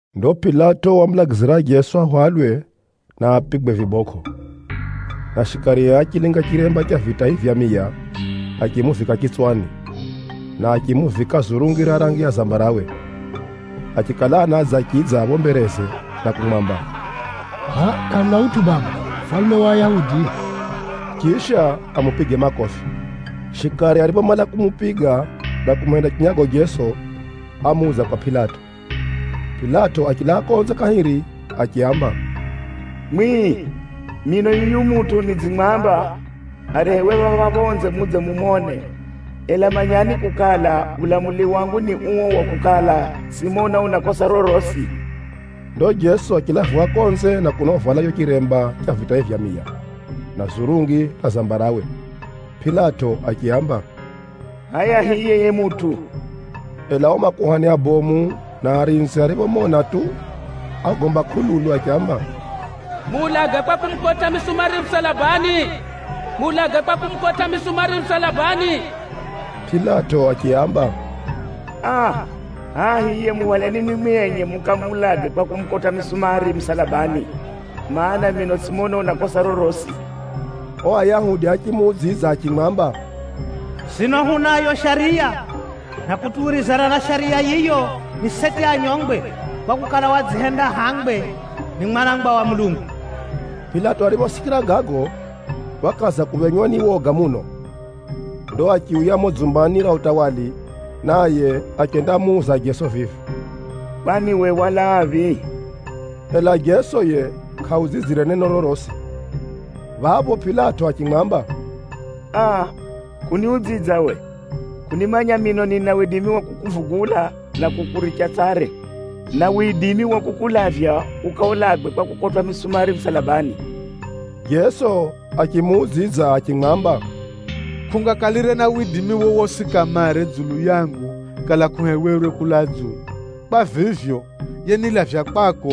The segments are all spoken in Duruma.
Ndo Pilato wamulagizira Jeso ahwalwe na apigwe vibokʼo. Na shikarie achilinga chiremba cha vitai vya miya, achimuvika chitswani, na achimuvika zurungi ra rangi ya zambarawe. Achikala anadza achidza phapho mbereze na kumwamba, “Hʼaya kʼamuna utʼu baba, mufalume wa Ayahudi!” Chisha amupige makofi. Shikari ariphomala kumupiga, na kumuhenda chinyago Jeso, ámuudza kwa Pilato. Pilato achilaa konze kahiri achiaamba, “Mwimwi, mino yuyu mutʼu nidzimwamba arehewe phapha phonze mudze mumone, ela manyani kukala, ulamuli wangu ni uo wa kukala, tsʼimona una kosa rorosi.” Ndo Jeso achilaviwa konze na kuno uvala chicho chiremba cha vitai vya miya, na zurungi ra zambarawe. Pilato achiaamba, “Hʼaya hiye yiye mutʼu!” Ela ao makuhani abomu na arinzi ariphomona tu, ágomba kʼululu achiamba, “Muulage kwa kumukotʼa misumari musalabani! Muulage kwa kumukotʼa misumari musalabani!” Pilato achiaamba, “Aa, hʼaya hiye, muhwaleni mwimwi enye mukamuulage kwa kumukotʼa misumari musalabani, mana, mino tsʼimona una kosa rorosi.” Ao Ayahudi achimuudzidza achimwamba, “Sino hunayo shariya, na kutuwirizana na shariya yiyo, ni seti anyongwe, kwakukala, wadzihenda hangwe ni Mwanangwa wa Mulungu.” Pilato ariphosikira gago, wakaza kuphenywa ni woga muno. Ndo achiuya mumo dzumbani ra utawala, naye achendamuuza Jeso vivi, “Kwani uwe walaaphi?” Ela Jeso yiye kʼaudzidzire neno rorosi. Phapho Pilato achimwamba, “Aa, kʼuniudzidza uwe! Kʼunimanya mino nina widimi wa kukuvugula na kukuricha tsare, na widimi wa kukulavya ukaulagwe kwa kukotwʼa misumari musalabani?” Jeso achimuudzidza achimwamba, “Kʼungakalire na widimi wowosi kamare dzulu yangu kala kʼuhewerwe kulaa dzulu. Kwa vivyo, yenilavya kwako,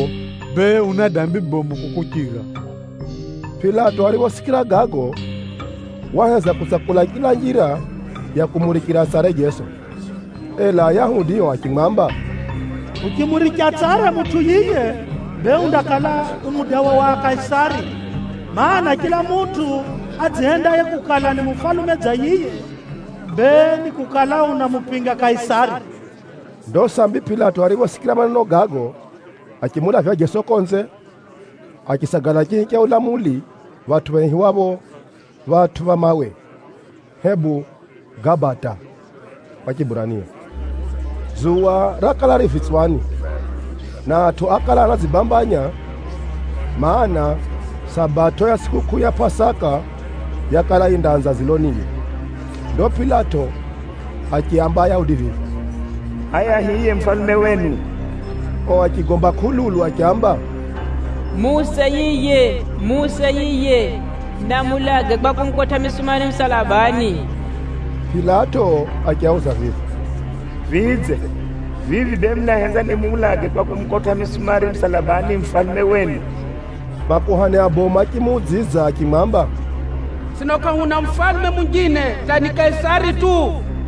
bee una dambi bomu kukuchira.” Pilato ariphosikira gago, waheza kutsakula chila njira ya kumurichira tsare Jeso. Ela Ayahudi ao achimwamba, “Uchimurichira tsare mutʼu yiye, bee undakala u mudawa wa Kaisari. Maana, chila mutʼu adzihendaye kukala, ni mufalume dza yiye, bee ni kukala unamupinga Kaisari!” Ndo sambi Pilato ariphosikira maneno gago, achimulavya Jeso konze, achisagala chihi cha ulamuli, phatʼu phaihiwapho “Phatʼu pha Mawe,” hebu “Gabata” kwa Chiburania. Dzuwa rakala riimire vitswani, na atʼu ákala anadzibambanya, mana, Sabato ya tsʼikukʼuu ya Pʼasaka yakala yindaanza dziloniye. Ndo Pilato achiaamba Ayahudi vivi, “Hʼaya hiye mufalume wenu!” Ao achigomba kʼululu achiamba, “Muuse yiye! Muuse yiye! Na muulage kwa kumukotʼa misumari musalabani!” Pilato achiauza vivi, “Vidze, vivi bee munahenza nimuulage kwa kumukotʼa misumari musalabani mufalume wenu?” Makuhani abomu achimuudzidza achimwamba, “Sino kʼahuna mufalume munjine hata ni Kaisari tu!”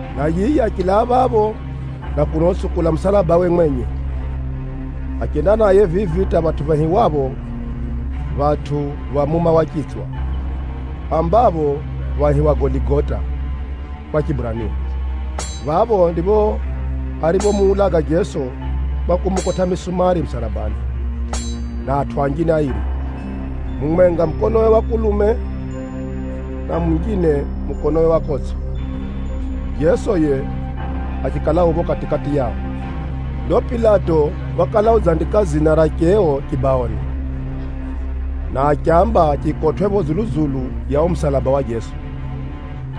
na yiye achilaa phapho na kuno utsukula musalabawe mwenye. Achenda naye vivi hata phatʼu phaihiwapho “Phatʼu pha Muma wa Chitswa” (ambapho phaihiwa “Goligota” kwa Chiburania). Phapho ndipho ariphomuulaga Jeso kwa kumukotʼa misumari musalabani, na atʼu anjine airi: mumwenga mukonowe wa kulume na munjine mukonowe wa kotsʼo, Jeso yiye achikala u phapho kati-kati yao. Ndo Pilato wakala udzandika dzina ra cheo chibaoni, na achiamba chikakotʼwe phapho dzulu-dzulu ya uo musalaba wa Jeso.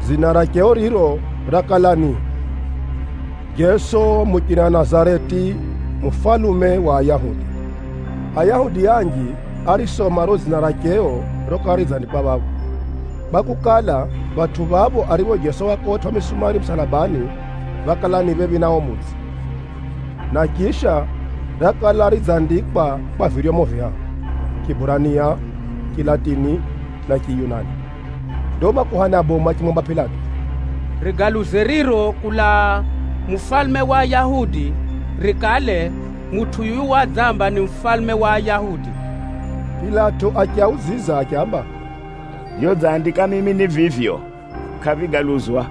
Dzina ra cheo riro rakala ni, “jeso muchina nazareti, mufalume wa ayahudi.” Ayahudi anji árisoma riro dzina ra cheo rokala ridzandikwa phapho, kwakukala, phatʼu phapho aripho Jeso wakotwʼa misumari musalabani, phákala ni phephi na uo mudzi. Na chisha, rakala ridzandikwa kwa viryomo vihahu, Chiburania, Chilatini na Chiyunani. Ndo makuhani abomu achimwamba Pilato, “Rigaluze riro kulaa, ‘Mufalume wa Ayahudi’ rikale, ‘Mutʼu yuyu wadzamba, ni Mufalume wa Ayahudi.’” Pilato achiudzidza achiamba, “Vyodzandika mimi ni vivyo, kʼavigaluzwa!”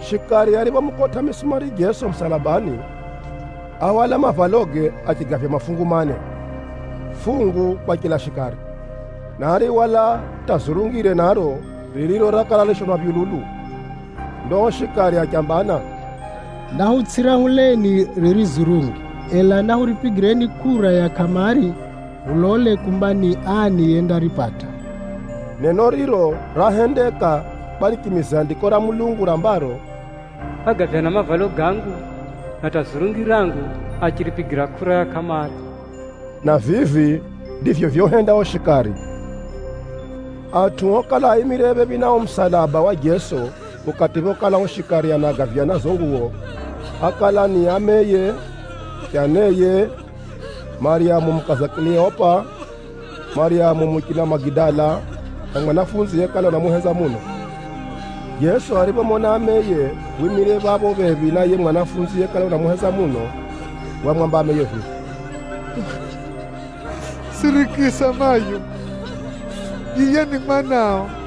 Shikari ariphomukotʼa misumari Jeso musalabani, áhwala mavaloge achigavya mafungu mane, fungu kwa chila shikari. Na árihwala hata zurungire naro, ririro rakala rishonwa phyululu. Ndo ao shikari achambana, “Nahutsʼirahuleni riri zurungi, ela nahuripigireni kʼura ya kʼamari hulole kumba ni ani yendaripata.” Neno riro rahendeka kwa richimize Andiko ra Mulungu rambaro, “Ágavyana mavalo gangu, na zurungi rangu achiripigira kʼura ya kʼamari.” Na vivi ndivyo vyohenda ao shikari. Atʼu okala aimire phephi na uo musalaba wa Jeso ukati phokala ao shikari anagavyana zizo nguwo, ákala ni ameye, chaneye, Maryamu mukaza Kileopa, Maryamu muchina Magidala na mwanafunzi yekala unamuhenza muno. Jeso ariphomona ameye wimire phapho phephi na yiye mwanafunzi yekala unamuhenza muno, wamwamba ameye vivi, “Sirikisa mayo! Yiye ni mwanao.”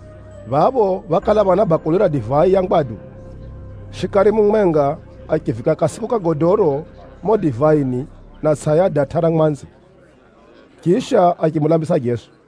Phapho phákala phana bakuli ra divai ya ngwadu. Shikari mumwenga achiviika kasiku ka godoro mumo divaini na atsʼa ya datʼa ra mwanzi, chisha achimulambisa Jeso.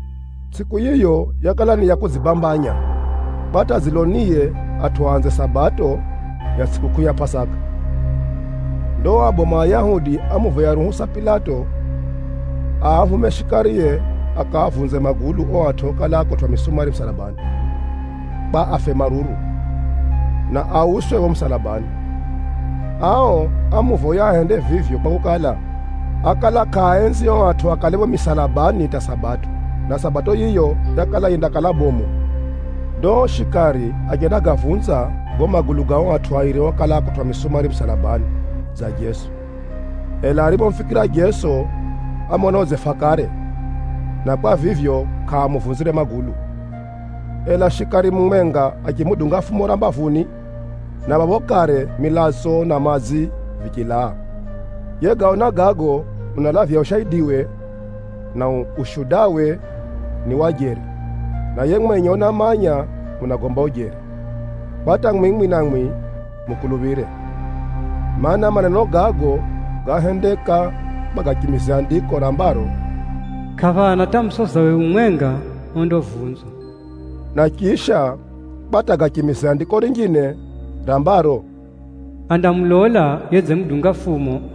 Tsʼiku yiyo yakala ni ya kudzibambanya, kwa hata dziloniye atʼu aanze Sabato ya tsʼikukʼuu ya Pʼasaka. Ndo ao abomu a Ayahudi ámuvoya ruhusa Pilato aahume shikarie akaavunze magulu ao atʼu okala akotwʼa misumari misalabani, kwa afe maruru, na auswe phapho misalabani. Ao ámuvoya ahende vivyo kwakukala, ákala kʼaaenzi ao atʼu akale phapho misalabani hata Sabato, na Sabato yiyo yakala yindakala bomu. Ndo ao shikari achendagavunza gago magulu ga ao atʼu airi okala akotwʼa misumari musalabani dza Jeso. Ela ariphomufikira Jeso, ámona udzefa kare, na kwa vivyo, kʼaamuvunzire magulu. Ela shikari mumwenga achimudunga fumo ra mbavuni, na phapho kare milatso na madzi vichilaa. (Yegaona gago, unalavya ushaidiwe, na ushudawe ni wa jeri na yiye mwenye unamanya unagomba ujeri, kwa hata mwimwi namwi mukuluphire.) Maana, maneno gago gáhendeka kwa gachimize Andiko rambaro, “Kʼaphana hata musozawe umwenga ondavunzwa.” Na chisha, kwa hata gachimize Andiko rinjine rambaro, “Andamulola yedzimudunga fumo.”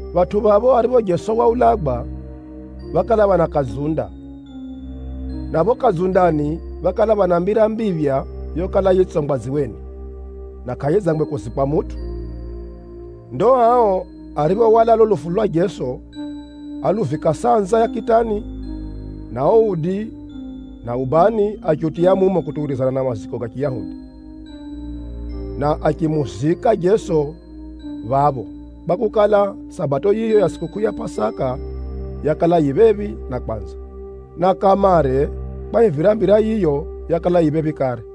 Phatʼu phapho aripho Jeso waulagwa, phákala phana kadzunda, na phapho kadzundani phákala phana mbira mbiphya yokala yitsongwa dziweni, na kʼayidzangwe kuzikwa mutʼu. Ndo ao ariphohwala lulo lufu lwa Jeso, áluvika sanza ya kitani, na uo udi na ubani achiutiya mumo kutuwirizana na maziko ga Chiyahudi. Na achimuzika Jeso phapho kwakukala, Sabato yiyo ya tsʼikukʼuu ya Pʼasaka, yakala yifika phephi na kwanza, na kamare kwahivira mbira yiyo yakala yifika phephi kare.